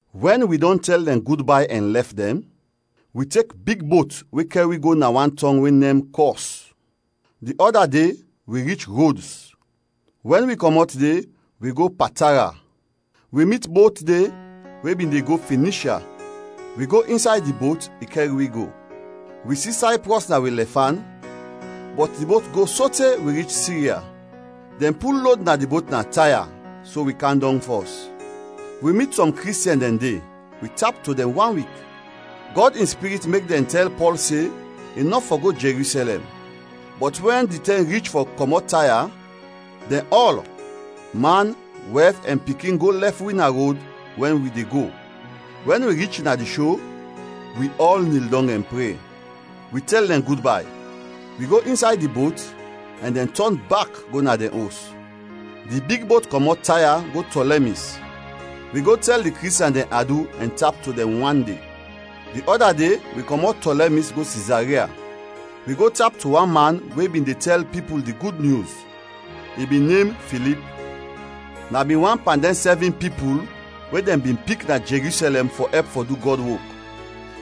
Wɛn wi dɔn tɛl dɛn gudbay ɛn lɛf dɛn, wi tek big bot we kɛr wi go na wan tɔng we nem Kɔs; di ɔda de wi rich Rods, wɛn wi kɔmɔt de, wi go Patara. Wi mit bot de we bin de go Finishya, wi go insay di bot, i kɛr wi go. Wi si Sayprɔs na wi lɛfan, bɔt di bot go sote wi rich Sirya. Dɛn pul lod na di bot na Taya so wi kam dɔng fɔs. Wi mit sɔm Kristiɛn dɛn de, wi tap to dɛn wan wik. Gɔd in Spirit mek dɛn tɛl Pɔl se i nɔ fɔ go Jerusɛlɛm. Bɔt wɛn di tɛm rich fɔ kɔmɔt Taya, dɛn ɔl, man, wɛf, ɛn pikin go lɛf wi na rod wɛn wi de go. Wɛn wi rich na di sho, wi ɔl nil dɔng ɛn pre. Wi tɛl dɛn gudbay. Wi go insay di bot ɛn dɛn tɔn bak go na dɛn os. Di big bot kɔmɔt Taya go Tɔlɛmis. Wi go tɛl di Kristiɛn dɛn adu ɛn tap to dɛn wan de. Di ɔda de wi kɔmɔt Tɔlɛmis go Sizaria. Wi go tap to wan man we bin de tɛl pipul di Gud Nyus, i bin nem Filip. Na bin wan pan dɛn sɛvin pipul we dɛn bin pik na Jerusɛlɛm fɔ ɛp fɔ du Gɔd wok.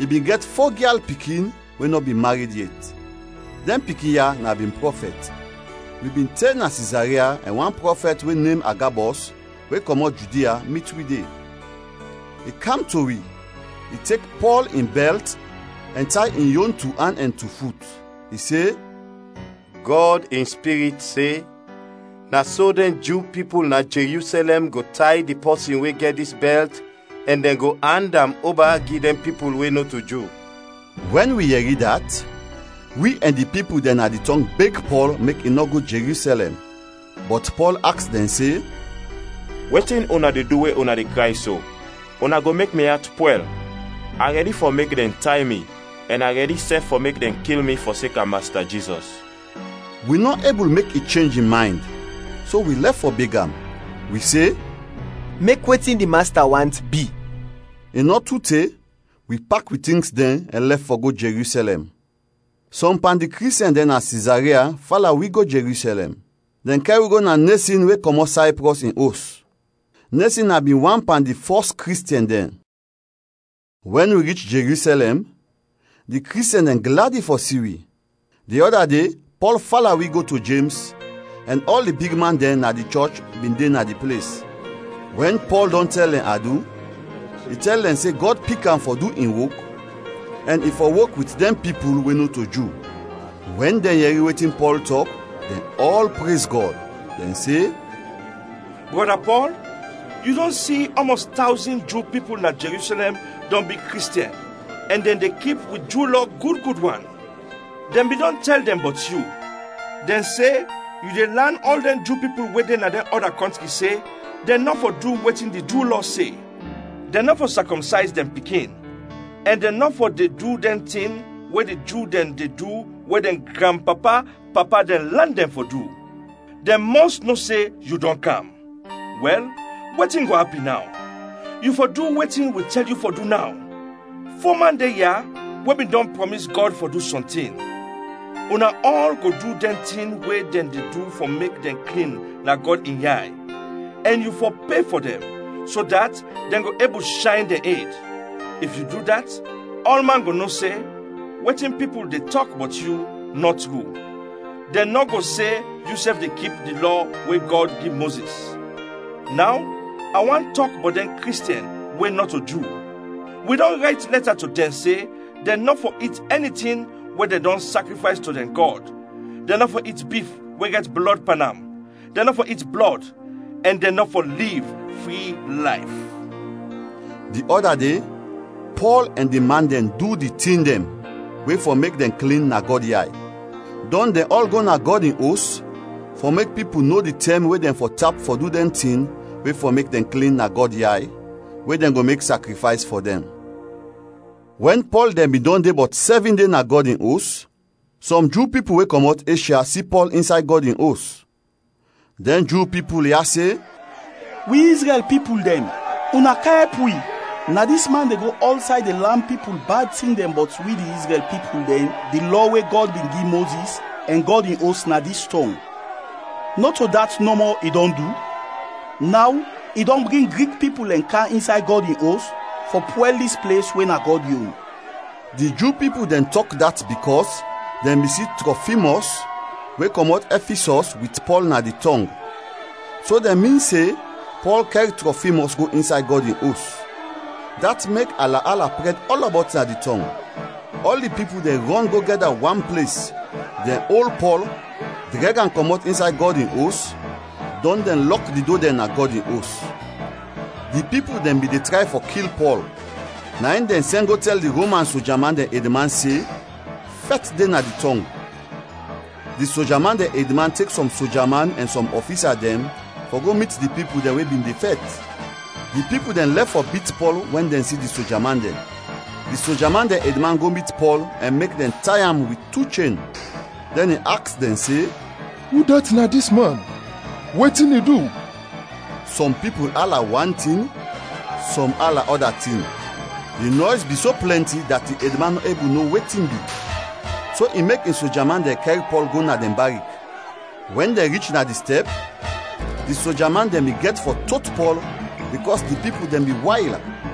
I bin gɛt fo gyal pikin we nɔ bin mared yet. Dɛn pikin ya na bin prɔfɛt. Wi bin te na Sizaria ɛn wan prɔfɛt we nem Agabɔs, we kɔmɔt Judia, mit wi de. I kam to wi, i tek Pɔl in bɛlt ɛn tay in yon tu an ɛn tu fut. I se, “Gɔd in Spirit se, ‘Na so dɛn Ju pipul na Jerusɛlɛm go tay di pɔsin we gɛt dis bɛlt ɛn dɛn go and am oba gi dɛn pipul we nɔto Ju.’” Wɛn wi yɛri dat, wi ɛn di pipul dɛn na di tɔng beg Pɔl mek i nɔ go Jerusɛlɛm. Bɔt Pɔl aks dɛn se, “Wetin una de du, we una de kray so, una go mek mi at pwɛl? A rɛdi fɔ mek dɛn tay mi ɛn a rɛdi sɛf fɔ mek dɛn kil mi fɔseka Masta Jizɔs.” Wi nɔ ebul mek i chenj in maynd, so wi lɛf fɔ beg am, wi se, “Mek wetin di Masta want, bi.” I nɔ tu te, wi pak wi tings dɛn ɛn lɛf fɔ go Jerusɛlɛm. Sɔm pan di Kristiɛn dɛn na Sizaria fala wi go Jerusɛlɛm. Dɛn kɛr wi go na Nesɔn we kɔmɔt Sayprɔs, in os; Nesɔn na bin wan pan di fɔs Kristiɛn dɛn. Wɛn wi rich Jerusɛlɛm, di Kristiɛn dɛn gladi fɔ si wi. Di ɔda de Pɔl fala wi go to Jems, ɛn ɔl di bigman dɛn na di chɔch bin de na di ples. Wɛn Pɔl dɔn tɛl dɛn adu, i tɛl dɛn se Gɔd pik am fɔ du in wok ɛn i fɔ wok wit dɛn pipul we nɔto Ju. Wɛn dɛn yɛri wetin Pɔl tɔk, dɛn ɔl prez Gɔd. Dɛn se, “Brɔda Pɔl, yu dɔn si ɔmɔs tawzin Ju pipul na Jerusɛlɛm dɔn bi Kristiɛn ɛn dɛn de kip wi Ju Lɔ gud gud wan. Dɛn bin dɔn tɛl dɛn bɔt yu, dɛn se yu de lan ɔl dɛn Ju pipul we de na dɛn ɔda kɔntri se dɛn nɔ fɔ de du wetin di Ju Lɔ se; dɛn nɔ fɔ sakɔmsayz dɛn pikin ɛn dɛn nɔ fɔ de du dɛn tin we di Ju dɛn de du we dɛn granpapa-papa dɛn lan dɛn fɔ du. Dɛn mɔs no se yu dɔn kam. Wɛl, wetin go apin naw? Yu fɔ du wetin wi de tɛl yu fɔ du naw. Fo man de ya we bin dɔn prɔmis Gɔd fɔ du sɔntin. Una ɔl go du dɛn tin we dɛn de du fɔ mek dɛn klin na Gɔd in yay, ɛn yu fɔ pe fɔ dɛn, so dat dɛn go ebul shayn dɛn ed. If yu du dat, ɔlman go no se wetin pipul bin de tɔk bɔt yu nɔ tru, dɛn go no se yusɛf de kip di Lɔ we Gɔd gi Mozis. Naw a want tɔk bɔt dɛn Kristiɛn we nɔto Ju: wi dɔn rayt lɛta to dɛn se dɛn nɔ fɔ it ɛni tin we dɛn dɔn sakrifays to dɛn gɔd, dɛn nɔ fɔ it bif we gɛt blɔd pan am, dɛn nɔ fɔ it blɔd, ɛn dɛn nɔ fɔ liv fri layf.” Di ɔda de, Pɔl ɛn di man dɛn du di tin dɛn we fɔ mek dɛn klin na Gɔd yay. Dɔn dɛn ɔl go na Gɔd in Os fɔ mek pipul no di tɛm we dɛn fɔ tap fɔ du dɛn tin we fɔ mek dɛn klin na Gɔd yay, we dɛn go mek sakrifays fɔ dɛn. Wɛn Pɔl dɛn bin dɔn de bɔt sɛvin de na Gɔd in Os, sɔm Ju pipul we kɔmɔt Eshya si Pɔl insay Gɔd in Os. Dɛn Ju pipul ya se, “Wi Izrɛl pipul dɛn, una kam ɛp wi! Na dis man de go ɔlsay de lan pipul bad tin dɛn bɔt wi di Izrɛl pipul dɛn, di Lɔ we Gɔd bin gi Mozis, ɛn Gɔd in Os na dis tɔng. Nɔto dat nɔmɔ i dɔn du, naw i dɔn bring Grik pipul dɛn kam insay Gɔd in Os fɔ pwɛl dis ples we na Gɔd yon!” Di Ju pipul dɛn tɔk dat bikɔs dɛn bin si Trɔfimɔs we kɔmɔt Ɛfisɔs wit Pɔl na di tɔng, so dɛn min se Pɔl kɛr Trɔfimɔs go insay Gɔd in Os. Dat mek ala-ala prɛd ɔlɔbɔt na di tɔng. Ɔl di pipul dɛn rɔn go gɛda wan ples, dɛn ol Pɔl, drɛg am kɔmɔt insay Gɔd in Os, dɔn dɛn lɔk di do dɛn na Gɔd in Os. Di pipul dɛn bin de tray fɔ kil Pɔl, na in dɛn sɛn go tɛl di Roman soja man dɛn edman se fɛt de na di tɔng. Di soja man dɛn edman tek sɔm soja man ɛn sɔm ɔfisa dɛn fɔ go mit di pipul dɛn we bin de fɛt. Di pipul dɛn lɛf fɔ bit Pɔl wɛn dɛn si di soja man dɛn. Di soja man dɛn edman go mit Pɔl ɛn mek dɛn tay am wit tu chen. Dɛn, i aks dɛn se, “Udat na dis man, wetin i du?” Sɔm pipul ala wan tin, sɔm ala ɔda tin. Di nɔys bin so plɛnti dat di edman nɔ ebul no wetin bi, so i mek in soja man dɛn kɛr Pɔl go na dɛn barik. Wɛn dɛn rich na di stɛp, di soja man dɛn bin gɛt fɔ tot Pɔl bikɔs di pipul dɛn bin wayl.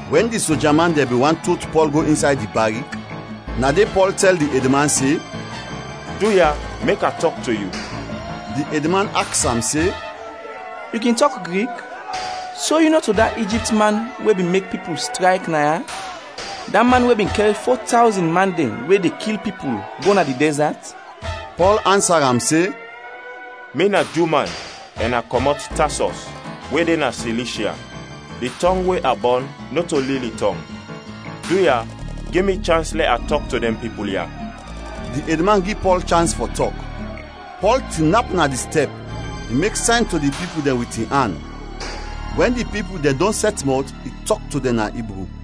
Wɛn di soja man dɛn bin want tot Pɔl go insay di barik, na de Pɔl tɛl di edman se, “Duya, mek a tɔk to yu!” Di edman aks am se, “Yu kin tɔk Grik? So yu nɔto da Ijipt man we bin mek pipul strayk naya, da man we bin kɛr fo tawzin man dɛn we de kil pipul, go na di dɛzat?” Pɔl ansa am se, “Mi na Ju man ɛn a kɔmɔt Tasɔs we de na Silishya. Di tɔng we a bɔn nɔto lili tɔng. Duya, gi mi chans lɛ a tɔk to dɛn pipul ya.” Di edman gi Pɔl chans fɔ tɔk. Pɔl tinap na di stɛp, i mek sayn to di pipul dɛn wit in an; wɛn di pipul dɛn dɔn sɛt mɔt, i tɔk to dɛn na Ibru.